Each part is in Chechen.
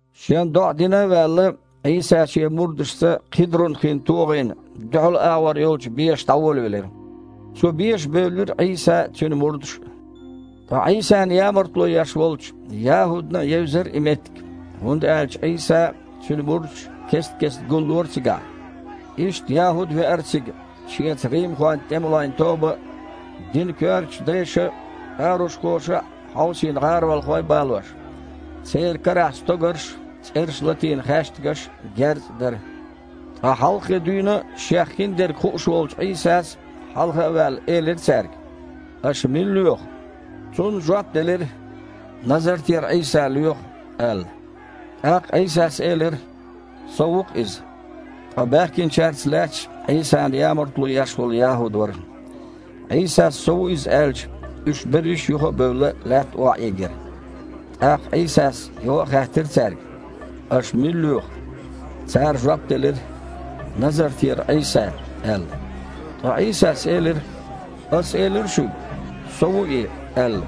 Шен доІа дина а ваьлла, Іийса Шен мурдашца Кхидрун-хин тогІина дуьхьал агІор йолчу беша дІаволавелира. Цу беша бевлира Іийса а, Цуьнан мурдаш а. Ткъа Іийсана ямартло еш волчу ЯхІудана а евзара и меттиг, хІунда аьлча Іийса а, Цуьнан мурдаш а кест-кестта гуллора цигахь. Иштта ЯхІуд а веара цига, шеца римхойн тІемалойн тоба а, динан коьртачу дайша а, парушхоша а хьовсийна гІаролхой а балош. Церан карахь стогарш а, цІераш латийна хаьштигаш а, герз а дара. Ткъа хьалххе дуьйна а Шех хин дерг хууш волчу Іийсас, хьалха а ваьлла, элира цаьрга: «Аша мила лоьху?» Цунна жоп делира: «Назартера Іийса лоьху», – аьлла. ТІаккха Іийсас элира: «Со ву-кх Иза». Ткъа баьхкинчаьрца лаьтташ Іийсана ямартло еш волу ЯхІуд вара. Іийсас «Со ву Иза» аьлча, уьш берриш, юха а бевлла, лаьтта охьаийгира. ТІаккха Іийсас юха а хаьттира цаьрга: «Аша мила лоьху?» Цара жоп делира: «Назартера Іийса», – аьлла. Ткъа Іийсас элира: «Ас элира шуьга, Со ву И, аьлла.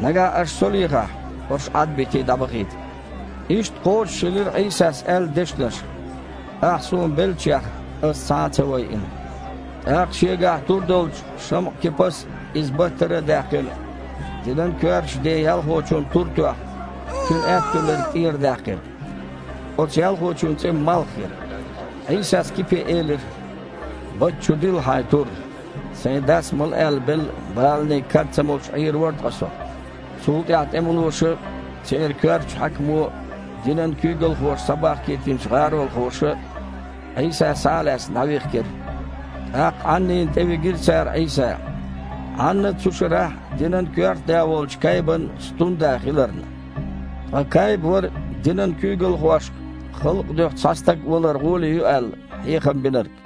Нагахь аша Со лехахь, хІорш, Іадбитий, дІабахийта». Иштта кхочушхилира Іийсас аьлла дешнаш: «Ахь Суна беллачех Ас цхьа а ца вайина». ТІаккха шегахь тур долчу ШамІа-Кипас, иза баттара а даьккхина, динан коьртачу ден ялхочунна тур а тоьхна, цуьнан аьтту лерг тІерадаьккхира. Оцу ялхочун цІе Малх яра. Іийсас Кипе элира: «Батта чу дилла хьайн тур. Сайн Дас мала аьлла белла баланийн кад ца молуш Іийр вара ткъа Со?» Цул тІаьхьа тІемалоша а, церан коьртачу хьаькамо а, динан куьйгалхоша схьабахкийтинчу гІаролхоша а Іийса, схьа а лаьцна, дІавихкира. ТІаккха Іаннина тІевигира цара Іийса, Іанна цу шарахь динан коьрта да волчу Кайбан стунда хиларна. Ткъа Кайба вара динан куьйгалхошка, халкъан дуьхьа цхьа стаг валар гІоле ю аьлла, хьехам бинарг.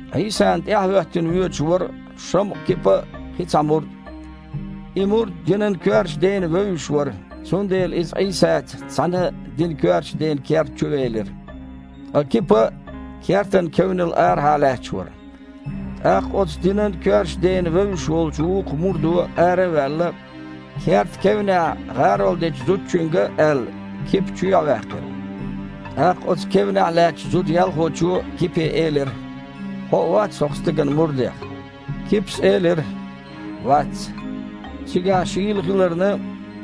Іийсана тІаьхьахІоьттина воьдуш вара ШамІа-Кипа а, кхин цхьа мурд а. И мурд динан коьртачу дена вевзаш вара, цундела иза Іийсаца цхьаьна динан коьртачу ден керта чу велира. Ткъа Кипа кертан кевнал арахьа лаьтташ вара. ТІаккха оцу динан коьртачу дена вевзаш волчу вукху мурдо, ара а ваьлла, кертан кевнехь гІарол дечу зудчуьнга а аьлла, Кипа чоьхьа ваьккхира. ТІаккха оцу кевнехь лаьттачу зуда-ялхочо Кипе элира: «Хьо а вац хІокху Стеган мурдех?» Кипас элира: «Вац». Цигахь шийла хиларна,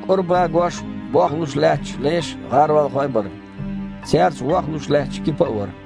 кІора багош, бохлуш лаьтташ леш а, гІаролхой а бара. Цаьрца вохлуш лаьтташ Кипа а вара.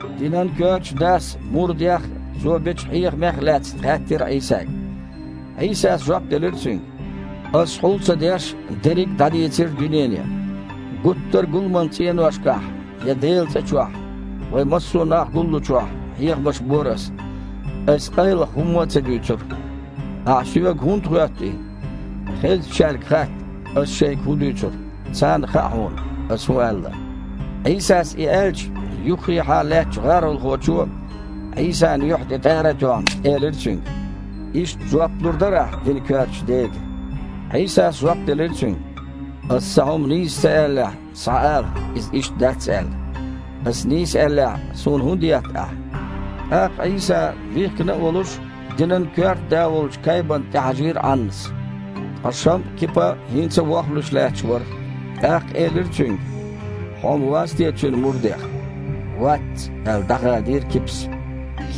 Динан коьртачу дас мурдех а, Цо бечу хьехамех а лаьцна хаьттира Іийсага. Іийсас жоп делира цуьнга: «Аса, хьул ца деш, дерриг дІадийцира дуьнене. Гуттара а гуламан цІеношкахь я Делан цІа чохь, вайн массо нах гуллучохь, хьехамаш бора Аса. Аса къайлаха хІумма а ца дуьйцура. Ахьа Соьга хІунда хоьтту и? Хезначаьрга хатта, Аса шайга хІун дуьйцура. Царна хаьа хьуна, Аса хІун аьлла». Іийсас и аьлча, юххехьа лаьттачу гІаролхочо, Іийсан юьхь тІе тІара а тоьхна, элира Цуьнга: «Иштта жоп лур дара Ахьа динан коьртачу дега?» Іийсас жоп делира цуьнга: «Ас цхьа хІума нийса ца аьллехь, схьаала, иза иштта дац аьлла. Аса нийса аьллехь, Суна хІунда етта ахь?» ТІаккха Іийса, вихкина а волуш, динан коьрта да волчу Кайбана тІехьажийра Іаннас. Ткъа ШамІа-Кипа хІинца а вохлуш лаьтташ вара. ТІаккха элира цуьнга: «Хьо-м вац те Цуьнан мурдех?» «Вац», – аьлла, дІахадийра Кипас.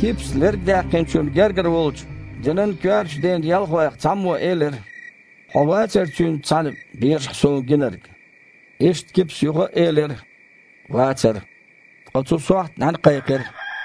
Кипас лерг даьккхинчун гергара волчу, динан коьртачу ден ялхойх цхьаммо элира: «Хьо вацара Цуьнца цхьаьна бешахь суна гинарг?» Иштта Кипас юха а элира: «Вацара». Ткъа цу сохьта нІаьна кхайкхира.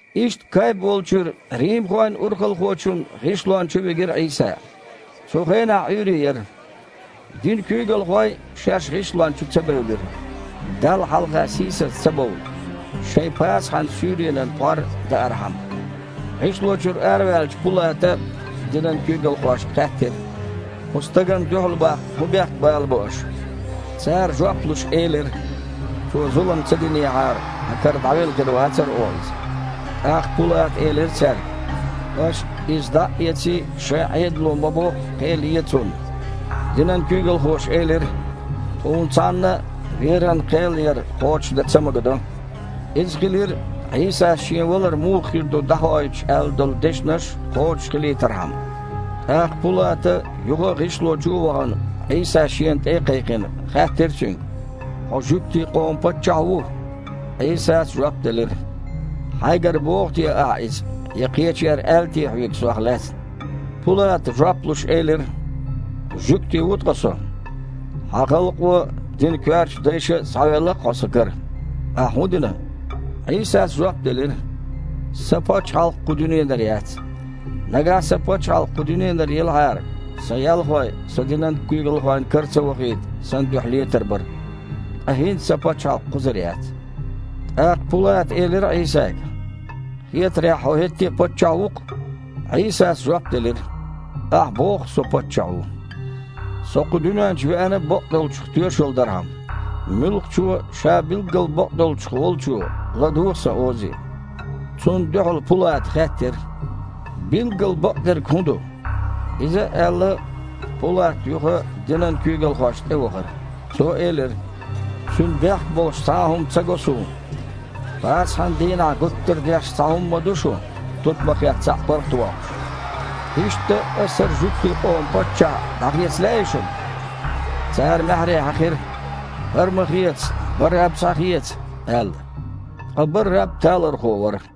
Иштта Кайба волчуьра римхойн урхалхочун гІишлона чу вигира Іийса. Цу хенахь Іуьйре яра. Динан куьйгалхой шаьш гІишлона чу ца бевлира, Далла хьалха сийсаз ца бовла, шайн Пасахьан суьйренан пхьор даархьама. ГІишло чуьра араваьллачу Пулата динан куьйгалхошка хаьттира: «Кху стагана дуьхьал баккха хІун бехк балабо аша?» Цара, жоп луш, элира: «Цо зулам ца динехьара, хьан кара дІавелла хир вацара оха Иза». ТІаккха Пулата элира цаьрга: «Аша, Иза дІа а эций, шайн Іедало ма-бохху, кхел е Цунна». Динан куьйгалхоша элира: «Тхуна цхьанна а веран кхел яр кхочушдан ца магадо». Иза хилира Іийсас Шен валар муха хир ду дІахоуьйтуш аьлла долу дешнаш кхочушхилийтархьама. ТІаккха Пулата, юха а гІишло чу а вахана, Іийса шена тІе а кхайкхина, хаьттира Цуьнга: «Хьо жуьгтийн къоман Паччахь ву?» Іийсас жоп делира: «Хьайгара боху те ахьа иза, я кхечара аьлла те хьоьга Сох лаьцна?» Пулата, жоп луш, элира: «Жуьгти ву ткъа со? Хьан халкъо а, динан коьртачу дайша а схьавелла-кх Хьо сан кара. Ахь хІун дина?» Іийсас жоп делира: «Сан Пачхьалкх кху дуьненара яц. Нагахь Сан Пачхьалкх кху дуьненара елахьара, Сан ялхой, Со динан куьйгалхойн кара ца вахийта, Сан дуьхьа летар бара. Ткъа хІинца Сан пачхьалкх кхузара яц». ТІаккха Пулата элира Іийсага: «Хетарехь, Хьо хІетте а Паччахь ву-кх?» Іийсас жоп делира: «Ахь боху-кх Со Паччахь ву. Со кху дуьнен чу веана бакъдолчух тоьшалла дархьама. Муьлххачо а, ша билггал бакъдолчух волчо, ладугІу Сан озе». Цунна дуьхьал Пулата хаьттира: «Билггал бакъдерг хІун ду?» Иза а аьлла, Пулат юха динан куьйгалхошна тІевахара. Цо элира: «Цуьнан бехк болуш цхьа а хІума ца го суна. Пасахьан дийнахь гуттара а деш цхьа хІума ма ду шун: тутмакхех цхьаъ паргІатвоккхуьйтуш. Иштта, ас хІара жуьгтийн къоман Паччахь дІахеца лаьий шуна?» Цара маьхьарий хьаькхира: «ХІара ма хеца, Барраб схьахеца», – аьлла. Ткъа Барраб талорхо вара.